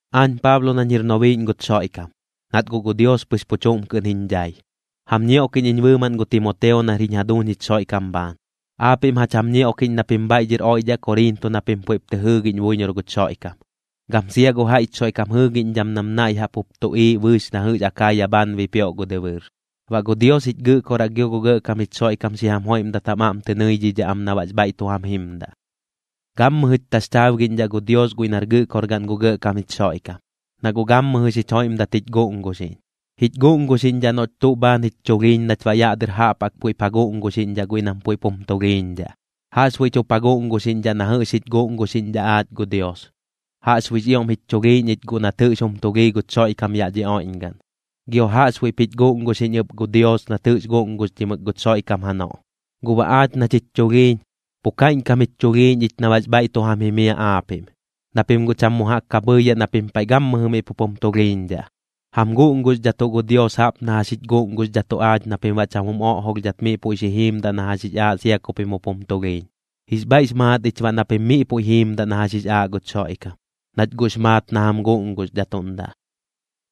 Aañ Paablo nañ jir nobiiꞌñ guch Xoiꞌkam, nat gu Dios pɨx pu chuꞌm kɨꞌn jiñ dhai, jam ñioꞌkiꞌñ iñ bɨɨmaꞌn gu Timoteo nar jiñ jaduuñ jich Xoiꞌkam bhaan. Aapiꞌm jach jam ñioꞌkiꞌñ na pim bhaiꞌ dhɨr oiꞌdhaꞌ Koriinto na pim puiꞌp tɨ jɨɨgiꞌñ buiñor guch Xoiꞌkam, gam sia gu jaiꞌch Xoiꞌkam jɨɨgiꞌñdham nam naiꞌ jaꞌp jup tuꞌiiꞌ bɨɨx na jɨꞌx Akaaya bhaan bipioꞌ gu dɨbɨɨr. Baꞌ gu Dios jich Gɨꞌkoraꞌ gio gu Gɇꞌkam jich Xoiꞌkam xi jam joiꞌmdat jam aꞌm tɨ nɨidhidhaꞌ am na baꞌx bhaiꞌ tu jam jimdaꞌ. Gammɨjɨch taxchaabgiꞌñdhaꞌ gu Dios guiꞌ nar Gɨꞌkorgaꞌn gu Gɇꞌkam jich Xoiꞌkam, na guꞌ gammɨjɨ xich joiꞌmdat jich guꞌnguxiꞌñ. Jich guꞌnguxiꞌñdhaꞌ noꞌch tuꞌ bhaan jich chulhiiñ nach baꞌ yaꞌ dɨr jaꞌp jaꞌk puiꞌp ja guꞌnguxiꞌñdhaꞌ guiꞌ nam puiꞌp jum tulhiiñdhaꞌ. Jaꞌxbuiꞌch jup ja guꞌnguxiꞌñdhaꞌ na jɨꞌx jich guꞌnguxiꞌñdhaꞌ aach gu Dios. Jaꞌxbuiꞌx ioꞌm jich chulhiiñ ich guꞌ nat jɨꞌx jum tulhii guch Xoiꞌkam yaꞌ dhi oiꞌñgaꞌn, gio jaꞌxbuiꞌp jich guꞌnguxiꞌñ ɨp gu Dios nat jɨꞌx guꞌnguxdhimɨk guch Xoiꞌkam janoꞌ. Guꞌ baꞌ aach nach jich chulhiiñ, pu kaiꞌñkam jich chulhiiñ ich na baꞌx bhaiꞌ tu jam jimiaꞌ aapiꞌm, na pim guꞌ cham mu jaꞌk ka bhɨɨyaꞌ na pim paiꞌ gammɨjɨ miꞌ pup jum tulhiiñdhaꞌ. Jam guꞌnguxdhatuꞌ gu Dios jaꞌp na jax jich guꞌnguxdhatuꞌ aach na pim baꞌ cham jum oꞌjolhdhat miꞌ puiꞌ xi jiimdaꞌ na jax jix aaꞌ sia ku pim jup jum tulhiiñ. Jix bhaiꞌx maat ich baꞌ na pim miꞌ puiꞌ pu jiimdaꞌ na jax jix aaꞌ guch Xoiꞌkam, nach guꞌx maat na jam guꞌnguxdhatuꞌndaꞌ.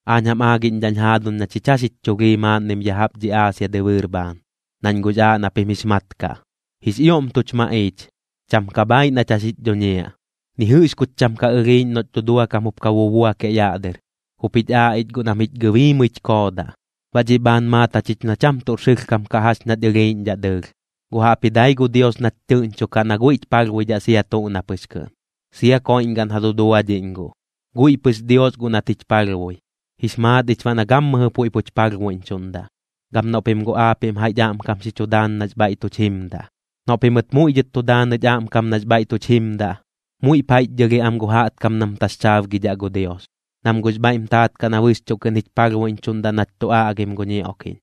Aañ jam aagiꞌñdhaꞌñ jaaduñ na chich jax jich chulhii maaꞌnnim ya jaꞌp dhi Aasia dɨbɨɨr bhaan, nañ guꞌx aaꞌ na pim jix mat kaꞌ. Jix ioꞌm tuch maꞌiich, cham ka bhaaiꞌ nach jax jich dhuñiaꞌ. Ni jɨꞌx kuch cham ka ɨlhiiꞌñ noꞌch duduakam jup ka bubuakiaꞌ yaꞌ dɨr, jup jich aaꞌ ich guꞌ nam jich gɨbiimɨich koodaꞌ. Baꞌ dhiꞌ bhaan maat jachich na cham tuꞌr sɨlhkam kaꞌ jax ñach ɨlhiiꞌñdhaꞌ dɨɨlh, guꞌ jaꞌpji dai gu Dios nach tɨꞌñchokaꞌ na guiꞌch palhbuiꞌñdhaꞌ sia tuꞌ na pɨx kɨꞌn, sia koiꞌñgaꞌn ja duduadhiꞌñ guꞌ. Guiꞌ pɨx Dios guꞌ nat jich palhbui, jix maat ich baꞌ na gammɨjɨ puiꞌ puch palhbuiꞌñchuꞌndaꞌ, gam noꞌ pim guꞌ aapiꞌm jaiꞌch aꞌmkam xi chu daan nax bhaiꞌ tuch jimdaꞌ. Noꞌ pimɨt muiꞌ dhɨt tu daanɨch aꞌmkam nax bhaiꞌ tuch jimdaꞌ, muiꞌp jaiꞌchdhɨlhiaꞌ am gu jaꞌtkam nam taxchaabgidhaꞌ gu Dios, nam guꞌx bhaiꞌm taat kaꞌ na bɨxchuꞌ kɨꞌn jich palhbuiꞌñchuꞌndaꞌ nach tu aꞌgim gu ñioꞌkiꞌñ.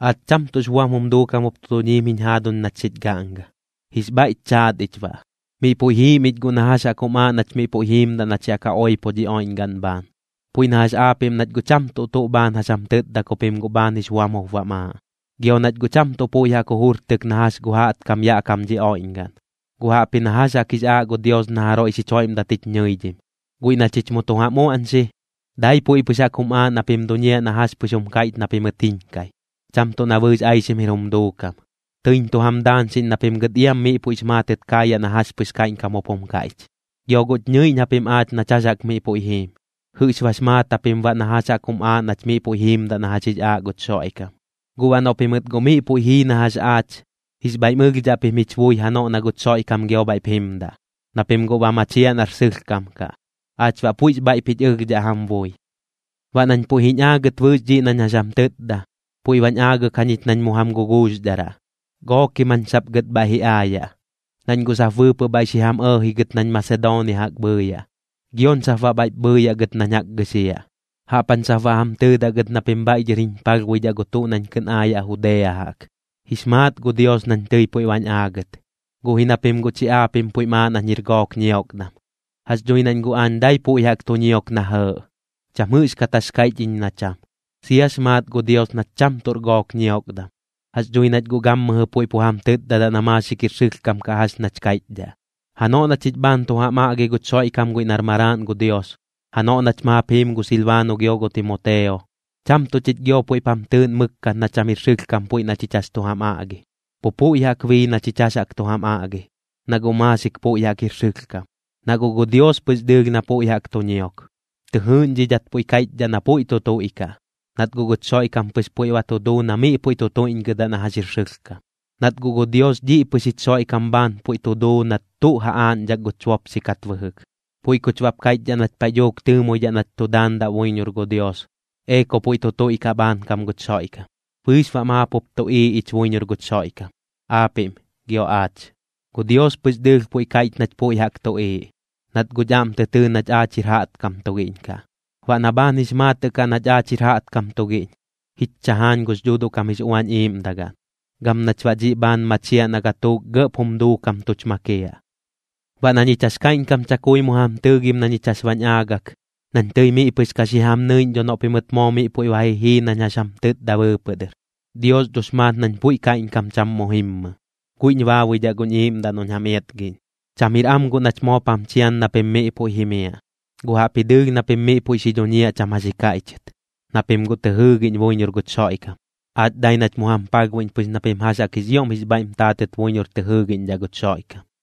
Aach cham tuꞌx buam jum duukam jup tu duñiim jiñ jaaduñ nach xich gaꞌnga, jix bhaiꞌch chaat ich baꞌ. Miꞌ puiꞌ jiim ich guꞌ na jax jaꞌk jum aaꞌ nach miꞌ puiꞌ jiimdaꞌ nach yaꞌ ka oipo dhi oiꞌñgaꞌn bhaan, puiꞌ na jax aapiꞌm nach guꞌ cham tuꞌ tuꞌ bhaan jax jam tɨtda ku pim guꞌ bhaan jix buam jup bam aaꞌ. Gio nach guꞌ cham tuꞌ puiꞌ jaꞌk jujurtɨk na jax gu jaꞌtkam yaꞌ kam dhi oiꞌñgaꞌn, guꞌ jaꞌpji na jax jaꞌk jix aaꞌ gu Dios na jaroiꞌ xich joiꞌmdat jich ñɨidhim. Guiꞌ na chich mu tu jam uaꞌñxi, dai puiꞌ pɨx jaꞌk jum aaꞌ na pim duñiaꞌ na jax pɨx jum kaiꞌch na pimɨt jiñkai, cham tuꞌ na bɨɨx aixim jir jum duukam. Tɨiñ tu jam daañxiꞌñ na pim gɨt iam miꞌ puiꞌx maatɨt kaayaꞌ na jax pɨx kaiꞌñkam jup jum kaiꞌch. Gio guꞌch ñɨiꞌñ japim aach nach jax jaꞌk miꞌ puiꞌ jiim, jɨꞌx bax maat japim baꞌ na jax jaꞌk jum aaꞌ nach miꞌ puiꞌ jiimdaꞌ na jax jix aaꞌ guch Xoiꞌkam. Guꞌ baꞌ noꞌ pimɨt guꞌ miꞌ puiꞌ jii na jax aach, jix bhaiꞌm ɨlhdhaꞌ pim jich bui janoꞌ na guch Xoiꞌkam gio bhaiꞌp jimdaꞌ, na pim guꞌ ba machiaꞌ nar sɨlhkam kaꞌ. Aach baꞌ puiꞌx bhaiꞌp jich ɨlhdhaꞌ jam bui. Baꞌ nañ puiꞌ jiñ aagɨt bɨɨx dhiꞌ nañ jax jam tɨtda, pui bañ aagɨk jañich nañ mu jam guguuxdharaꞌ, gookim jañ sap gɨt bhaiꞌ ji aayaꞌ. Nañ guꞌ sap bɨɨpɨꞌ bhaiꞌ xi jam ɇɇji gɨt nañ Masedoonia jaꞌk bhɨɨyaꞌ, gioñ sap baꞌ bhaiꞌp bhɨɨyaꞌ gɨt nañ jaꞌk gɨxiaꞌ. Jaꞌp jañ sap baꞌ jam tɨɨdaꞌ gɨt na pim bhaiꞌ dhɨr jiñ palhbuidhaꞌ gu tuꞌ nañ kɨꞌn aayaꞌ Judea jaꞌk. Jix maat gu Dios nañ tɨi puiꞌ bañ aagɨt, guꞌ ji na pim guꞌ chi aapiꞌm puiꞌm aaꞌ nañ jir gook ñiokdam. Jax dhui nañ guꞌ aañ dai puiꞌ jaꞌk tu ñiok na jɇɇꞌ, cham jɨꞌxkat jax kaiꞌch iñ na cham. Siax maat gu Dios nach cham tuꞌr gook ñiokdam, jax dhui nach guꞌ gammɨjɨ puiꞌ pu jam tɨtdadaꞌ na maaxik jir sɨlhkam kaꞌ jax nach kaiꞌchdhaꞌ. Janoꞌ na chich bhaan tu jam aꞌgi guch Xoiꞌkam guiꞌ nar Maraaꞌn gu Dios, janoꞌ nach maap jiim gu Silbaano gio gu Timoteo, cham tuꞌ chich gio puiꞌp jam tɨɨꞌn mɨkkat na cham jir sɨlhkam puiꞌ na chich jax chu jam aꞌgi, pu puiꞌ jaꞌk bii na chich jax jaꞌk tu jam aꞌgi, na guꞌ maaxik puiꞌ jaꞌk jir sɨlhkam. Na guꞌ gu Dios pɨx dɨɨlh na puiꞌ jaꞌk tu ñiok, tɨ jɨɨꞌñdhidhat puiꞌ kaiꞌchdhaꞌ na puiꞌ tu tuiꞌkaꞌ, nat guꞌ guch Xoiꞌkam pɨx puiꞌ ba tu duu na miꞌ puiꞌ tu tuiꞌñgɨdaꞌ na jax jir sɨlhkam. Nat guꞌ gu Dios dhiꞌ pɨx jich Xoiꞌkam bhaan puiꞌ tu duu nat tuꞌ ja aaꞌñdhak guch bopxi kat bɨjɨk, puiꞌ kuch baꞌp kaiꞌchdhaꞌ nach paiꞌ dhuuk tɨɨmoidhaꞌ nach tu daandaꞌ buiñor gu Dios: “Ee ku puiꞌ tu tuiꞌkaꞌ bhaankam guch Xoiꞌkam.” Bɨɨx baꞌ maap jup tuꞌiiꞌ ich buiñor guch Xoiꞌkam, aapiꞌm gio aach. Gu Dios pɨx dɨɨlh puiꞌ kaiꞌch nach puiꞌ jaꞌk tuꞌiiꞌ, nat guꞌch aꞌm tɨ tɨɨ nach aach jir jaꞌtkam tugiꞌñ kaꞌ. Baꞌ na bhaan jix maatɨꞌ kaꞌ nach aach jir jaꞌtkam tugiꞌñ, jich chajaañ gux Dhuuduꞌ kam jix Uañ Iiꞌmdagaꞌn, gam nach baꞌ dhiꞌ bhaan machiaꞌ na gatuuk gɇꞌp jum duukam tuch makiaꞌ. Baꞌ na ñich jax kaiꞌñkam chakui mu jam tɨɨgim na ñich jax bañ aagɨk, nañ tɨi miꞌ pɨx ka xi jam nɨiꞌñ dho noꞌ pimɨt moo miꞌ puiꞌ ba ji jii nañ jax jam tɨtda bɨɨpɨꞌ dɨr. Dios dhox maat nañ puiꞌ kaiꞌñkam cham mu jimmɨ, guiꞌñ baabuidhaꞌ guñ iiꞌmdaꞌ noꞌñ jam iatgiꞌñ. Cham jir am guꞌ nach moop jam chian na pim miꞌ puiꞌ jimiaꞌ, guꞌ jaꞌpji dɨɨlh na pim miꞌ puiꞌ xi dhuñiaꞌ cham jax ji kaiꞌchɨt, na pim guꞌ tɨ jɨɨgiꞌñ buiñor guch Xoiꞌkam. Aach dai nach mu jam palhbuiꞌñ pɨx na pim jax jaꞌk jix ioꞌm jix bhaiꞌm taatɨt buiñor tɨ jɨɨgiꞌñdhaꞌ guch Xoiꞌkam.